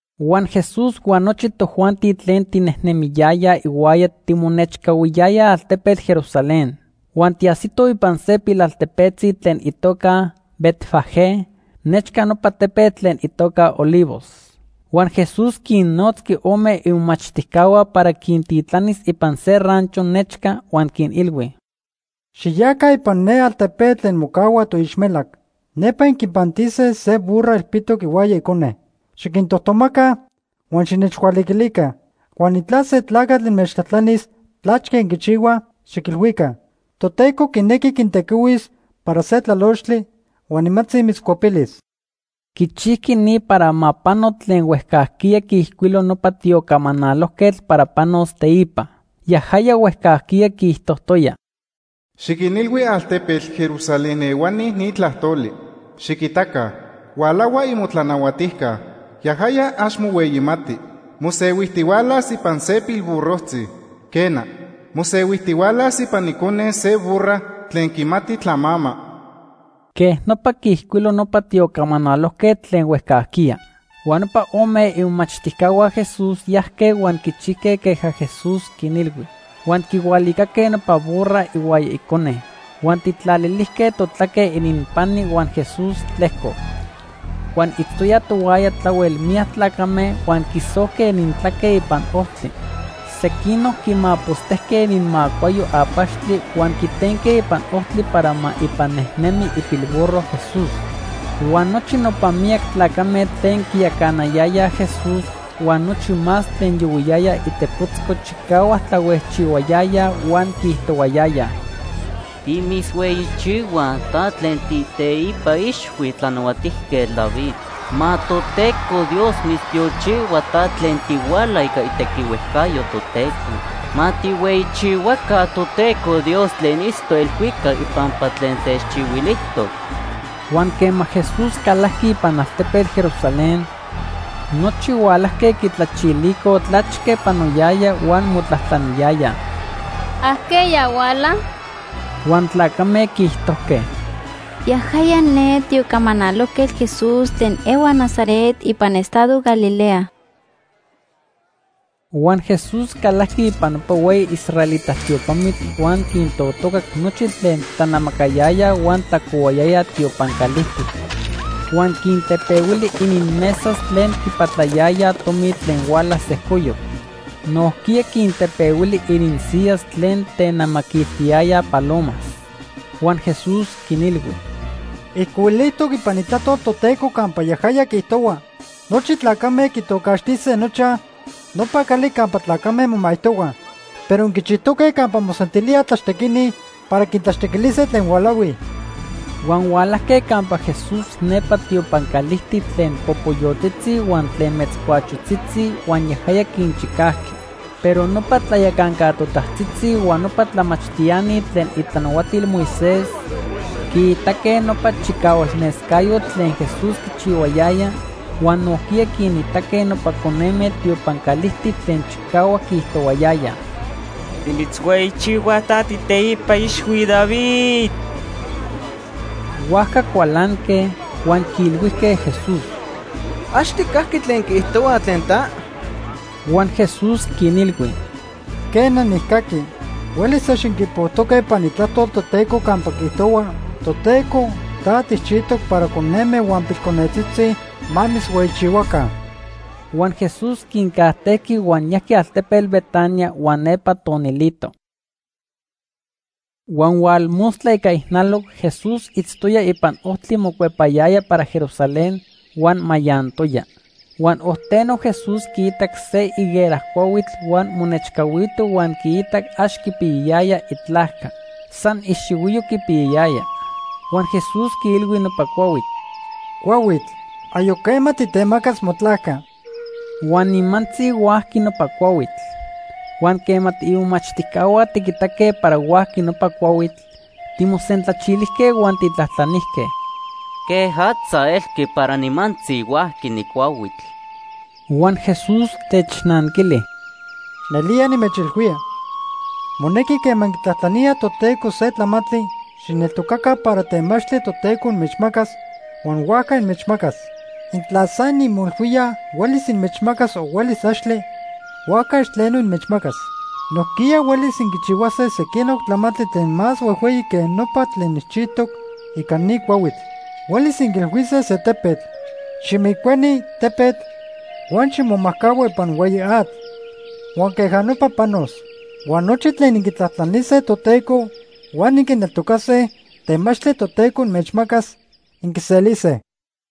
Huan Jesús huan nochi tojuanti tlen tinejnemiyayaj ihuaya timonechcahuiyayaj altepetl Jerusalén. Huan tiajsitoj ipan se pilaltepetzi tlen itoca Betfagé, nechca nopa tepetl tlen itoca Olivos. Huan Jesús quinnotzqui ome imomachtijcahua para quintitlanis ipan se rancho nechca. Huan quinilhui: ―Xiyaca ipan ne altepetl tlen mocahua toixmelac. Nepa inquipantise se burra ilpitoc ihuaya icone. Xiquintojtomaca huan xinechhualiquilica. Huan intla se tlacatl inmechtlajtlanis tlachque inquichihuaj, xiquilhuica: ‘Toteco quinequi quintequihuis para se tlalochtli huan nimantzi mitzcuepilis.’ Quichijqui ni para ma pano tlen huejcajquiya quiijcuilo nopa tiocamanalojquetl para panos teipa. Yajaya huejcajquiya quiijtojtoya: “Xiquinilhui altepetl Jerusalén ehuani ni tlajtoli: ‘Xiquitaca, hualahua imotlanahuatijca. Yajaya ax mohueyimati. Mosehuijtihualas ipan se pilburrojtzi. Quena, mosehuijtihualas ipan icone se burra tlen quimati tlamama.’” Quej nopa quiijcuilo nopa tiocamanalojquetl tlen huejcajquiya. Huan nopa ome imomachtijcahua Jesús yajque huan quichijque queja Jesús quinilhui. Huan quihualicaque nopa burra ihuaya icone. Huan tijtlalilijque totlaque ininpani huan Jesús tlejcoc. Huan itztoyaj tohuaya tlahuel miyac tlacame huan quisojque inintlaque ipan ojtli. Sequinoc quimapostejque ininmacuayo apachtli huan quitenque ipan ojtli para ma ipan nejnemi ipilburro Jesús. Huan nochi nopa miyac tlacame tlen quiyacanayayaj Jesús huan nochi más tlen yohuiyayaj itepotzco chicahuac tlahuejchihuayayaj huan quiijtohuayayaj: “¡Timitzhueyichihuaj ta tlen tiiteipa ixhui Tlanahuatijquetl David! ¡Ma Toteco Dios mitztiochihua ta tlen tihuala ica itequihuejcayo Toteco! ¡Ma tijhueyichihuaca Toteco Dios tlen itztoc elhuicac ipampa tlen techchihuilijtoc!” Huan quema Jesús calajqui ipan altepetl Jerusalén, nochi hualajque quitlachilicoj tlachque panoyaya huan motlajtlaniyayaj: ―¿Ajqueya huala? Huan tlacame quiijtojque: ―Yajaya ne tiocamanalojquetl Jesús tlen ehua Nazaret ipan estado Galilea. Huan Jesús calajqui ipan nopa hueyi israelita tiopamitl huan quintotocac nochi tlen tlanamacayayaj huan tlacohuayayaj tiopan calijtic. Huan quintepehuili ininmesas tlen quipatlayayaj tomi tlen huala sejcoyoc. Nojquiya quintepehuili ininsiyas tlen tenamaquiltiyayaj palomas. Huan Jesús quinilhui: ―Ijcuilijtoc ipan Itlajtol Toteco campa yajaya quiijtohua: ‘Nochi tlacame quitocaxtise nochaj: Nopa Cali Campa Tlacame Momaijtohuaj.’ Pero inquichijtoque campa mosentilíaj tlaxtequini para quintlaxtequilise tlen hualahuij. Huan hualajque campa Jesús nepa tiopan calijtic tlen popoyotzitzi huan tlen metzcuachotzitzi, huan yajaya quinchicajqui. Pero nopa tlayacanca totajtzitzi huan nopa tlamachtiani tlen itlanahuatil Moisés quiitaque nopa chicahualnescayotl tlen Jesús quichihuayaya huan nojquiya quinitaque nopa coneme tiopan calijtic tlen chicahuac quiijtohuayayaj: “Timitzhueyichihuaj ta tiiteipa ixhui David.” Huajca cualanque, huan quiilhuijque Jesús: ―¿Ax tijcaqui tlen quiijtohuaj tlen ta? Huan Jesús quinilhui: ―Quena, nijcaqui. Huelis ax inquipojtoque ipan Itlajtol Toteco campa quiijtohua: ‘Toteco ta tijchijtoc para coneme huan pilconetzitzi ma mitzhueyichihuaca.’ Huan Jesús quincajtejqui huan yajqui altepetl Betania huan nepa tonilito. Huan hualmostla ica ijnaloc Jesús itztoya ipan ojtli mocuepayaya para Jerusalén huan mayantoya. Huan ojteno Jesús quiitac se higuera cuahuitl huan monechcahuito huan quiitac ax quipiyayaya itlajca. San ixihuiyo quipiyayaya. Huan Jesús quiilhui nopa cuahuitl: ―Cuahuitl, ayoc quema titemacas motlajca. Huan nimantzi huajqui nopa cuahuitl. Huan quema tiimomachtijcahua tiquitaque para huajqui nopa cuahuitl, timosentlachilijque huan tijtlajtlanijque: ―¿Quejatza elqui para nimantzi huajqui ni cuahuitl? Huan Jesús technanquili: ―Nelía nimechilhuía, monequi quema inquitlajtlaníaj Toteco se tlamantli, xijneltocaca para temachtli Toteco inmechmacas huan huajca inmechmacas. Intla san inmoilhuíaj huelis inmechmacas o huelis axtle, huajca ax tleno inmechmacas. Nojquiya huelis inquichihuase sequinoc tlamantli tlen más huejhueyi que nopa tlen nijchijtoc ica ni cuahuitl. Huelis inquiilhuise se tepetl: ‘Ximijcueni, tepetl, huan ximomajcahua ipan hueyi atl’, huan queja nopa panos. Huan nochi tlen inquitlajtlanise Toteco huan inquineltocase temachtli Toteco inmechmacas, inquiselise.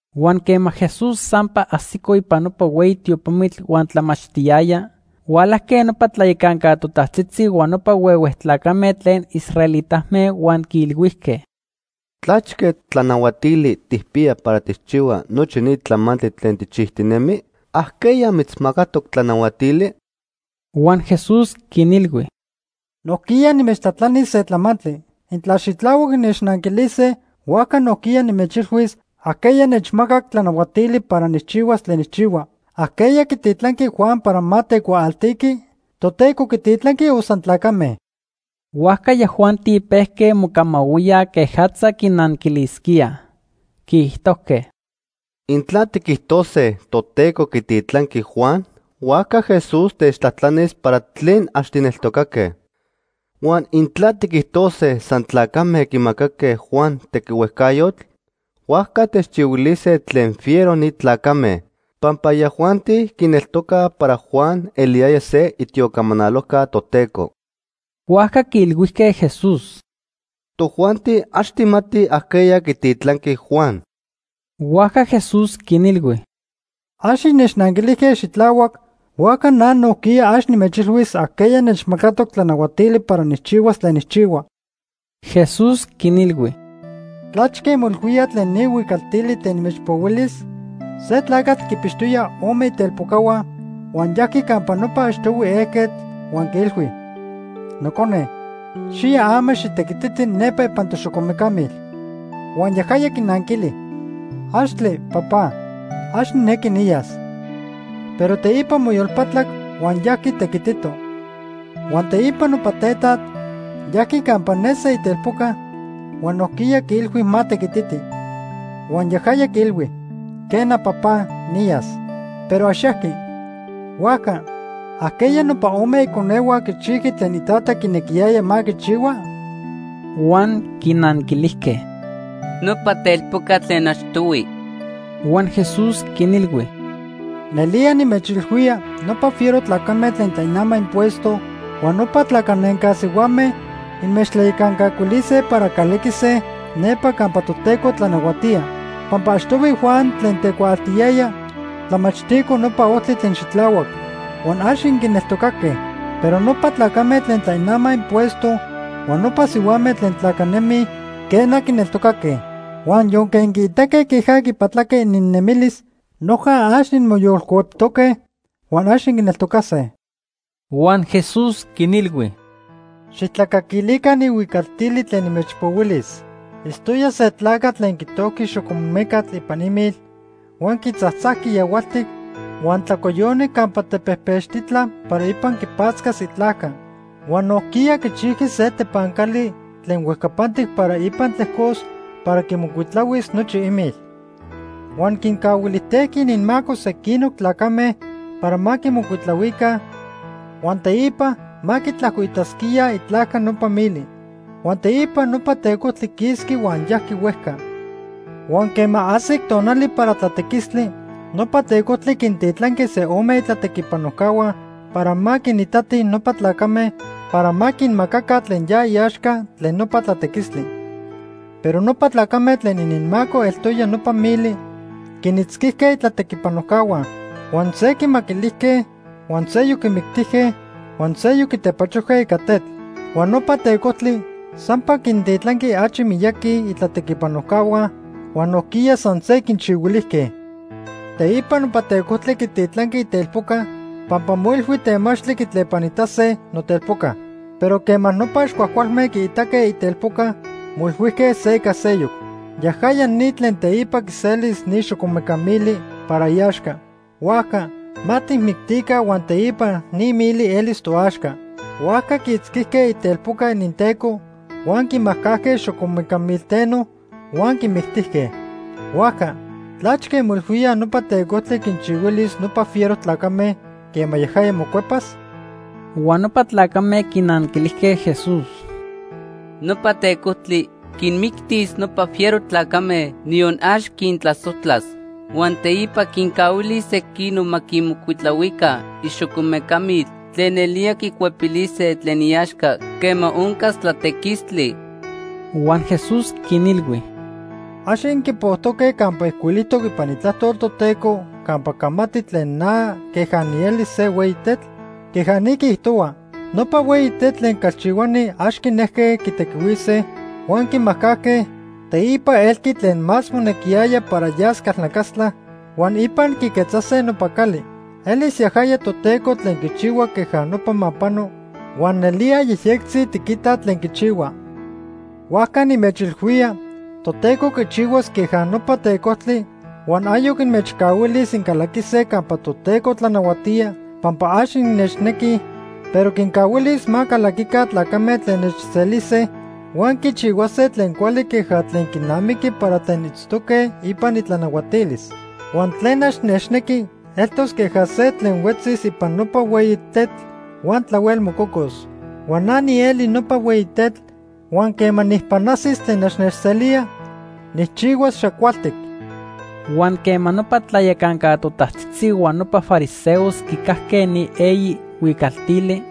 Huan quema Jesús sampa ajsico ipan nopa hueyi tiopamitl huan tlamachtiyaya, hualajque nopa tlayacanca totajtzitzi huan nopa huehue tlacame tlen israelitame huan quiilhuijque: ―¿Tlachque tlanahuatili tijpiya para tijchihua nochi ni tlamantli tlen tijchijtinemi? ¿Ajqueya mitzmacatoc tlanahuatili? Huan Jesús quinilhui: ―Nojquiya nimechtlajtlanis se tlamantli. Intla xitlahuac innechnanquilise, huajca nojquiya nimechilhuis ajqueya nechmacac tlanahuatili para nijchihuas tlen nijchihua. ¿Ajqueya quititlanqui Juan para ma tecuaaltiqui? ¿Toteco quititlanqui o san tlacame? Huajca yajuanti pejque mocamahuíaj quejatza quinanquilisquíaj. Quiijtojque: ―Intla tiquijtose Toteco quititlanqui Juan, huajca Jesús techtlajtlanis para tlen ax tijneltocaque. Huan intla tiquijtose san tlacame quimacaque Juan tequihuejcayotl, huajca techchihuilise tlen fiero ni tlacame, pampa yajuanti quineltocaj para Juan eliyaya se itiocamanalojca Toteco. Huajca quiilhuijque Jesús: ―Tojuanti ax tijmatij ajqueya quititlanqui Juan. Huajca Jesús quinilhui: ―Ax innechnanquilijque xitlahuac, huajca na nojquiya ax nimechilhuis ajqueya nechmacatoc tlanahuatili para nijchihuas tlen nijchihua. Jesús quinilhui: ―¿Tlachque inmoilhuíaj tlen ni huicaltili tlen nimechpohuilis? Se tlacatl quinpixtoya ome itelpocahua huan yajqui campa nopa achtohui ejquetl huan quiilhui: ‘Nocone, xiya ama xitequititi nepa ipan toxocomecamil.’ Huan yajaya quinanquili: ‘Axtle, Papá, ax nijnequi niyas.’ Pero teipa moyolpatlac huan yajqui tequitito. Huan teipa nopa tetat yajqui campa ne se itelpoca huan nojquiya quiilhui ma tequititi. Huan yajaya quiilhui: ‘Quena, Papá, niyas.’ Pero ax yajqui. Huajca, ¿ajqueya nopa ome iconehua quichijqui tlen itata quinequiyaya ma quichihua? Huan quinanquilijque: ―Nopa telpocatl tlen achtohui. Huan Jesús quinilhui: ―Nelía nimechilhuía nopa fiero tlacame tlen tlainamaj impuesto huan nopa tlacanenca sihuame inmechtlayacancuilise para calaquise nepa campa Toteco tlanahuatía. Pampa achtohui Juan tlen tecuaaltiyaya tlamachtico nopa ojtli tlen xitlahuac, huan ax inquineltocaque. Pero nopa tlacame tlen tlainamaj impuesto huan nopa sihuame tlen tlacanemij, quena, quineltocaque. Huan yonque inquiitaque queja quipatlaque ininnemilis, noja ax inmoyolcueptoque huan ax inquineltocase. Huan Jesús quinilhui: ―Xijtlacaquilica ni huicaltili tlen nimechpohuilis. Itztoya se tlacatl tlen quitojqui xocomecatl ipan imil huan quitzajtzajqui yahualtic huan tlacoyoni campa tepejpechtitla para ipan quipatzcas itlajca. Huan nojquiya quichijqui se tepancali tlen huejcapantic para ipan tlejcos para quimocuitlahuis nochi imil. Huan quincahuilijtejqui ininmaco sequinoc tlacame para ma quimocuitlahuica huan teipa ma quitlajcoitasquíaj itlajca nopa mili. Huan teipa nopa tecojtli quisqui huan yajqui huejca. Huan quema ajsic tonali para tlatequistli, nopa tecojtli quintitlanqui se ome itlatequipanojcahua para ma quinitatij nopa tlacame para ma quinmacaca tlen ya iaxca tlen nopa tlatequistli. Pero nopa tlacame tlen ininmaco eltoya nopa mili quinitzquijque itlatequipanojcahua; huan se quimaquilijque, huan seyoc quimictijque, huan seyoc quitepachojque ica tetl. Huan nopa tecojtli sampa quintitlanqui achi miyaqui itlatequipanojcahua huan nojquiya san se quinchihuilijque. “Teipa nopa tecojtli quititlanqui itelpoca pampa moilhui temachtli quitlepanitase notelpoca. Pero quema nopa ax cuajcualme quiitaque itelpoca, moilhuijque se ica seyoc: ‘Yajaya ni tlen teipa quiselis ni xocomeca mili para iaxca. Huajca ma tijmictica huan teipa ni mili elis toaxca.’ Huajca quiitzquijque itelpoca ininteco huan quimajcajque xocomeca milteno huan quimictijque. “Huajca, ¿tlachque inmoilhuíaj nopa tecojtli quinchihuilis nopa fiero tlacame quema yajaya mocuepas?” Huan nopa tlacame quinanquilijque Jesús: ―Nopa tecojtli quinmictis nopa fiero tlacame, niyon ax quintlasojtlas. Huan teipa quincahuilis sequinoc ma quimocuitlahuica ixocomecamil tlen nelía quicuepilise tlen iaxca quema oncas tlatequistli. Huan Jesús quinilhui: ―¿Ax inquipojtoque campa ijcuilijtoc ipan Itlajtol Toteco campa camati tlen na queja nieli se hueyi tetl? Queja ni quiijtohua: ‘Nopa hueyi tetl tlen calchihuani ax quinejque quitequihuise, huan quimajcajque, teipa elqui tlen más monequiyaya para yas calnacastla, huan ipan quiquetzase nopa cali. Elis yajaya Toteco tlen quichihua queja nopa ma pano, huan nelía yejyectzi tiquitaj tlen quichihua.’ Huajca nimechilhuía Toteco quichihuas queja nopa tecojtli huan ayoc inmechcahuilis incalaquise campa Toteco tlanahuatía pampa ax innechnequij, pero quincahuilis ma calaquica tlacame tlen nechselise huan quichihuase tlen cuali queja tlen quinamiqui para tlen itztoque ipan itlanahuatilis. Huan tlen ax nechnequi eltos queja se tlen huetzis ipan nopa hueyi tetl huan tlahuel mococos. Huan na nieli nopa hueyi tetl huan quema nijpanajsis tlen ax nechselía, nijchihuas xacualtic. Huan quema nopa tlayacanca totajtzitzi huan nopa fariseos quicajque ni eyi huicaltili,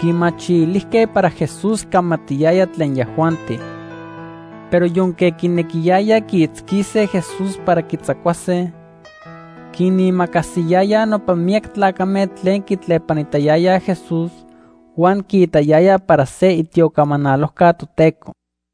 quimachilijque para Jesús camatiyaya tlen yajuanti. Pero yonque quinequiyayaj quiitzquise Jesús para quitzacuase, quinimacasiyayaj nopa miyac tlacame tlen quitlepanitayayaj Jesús huan quiitayayaj para se itiocamanalojca Toteco.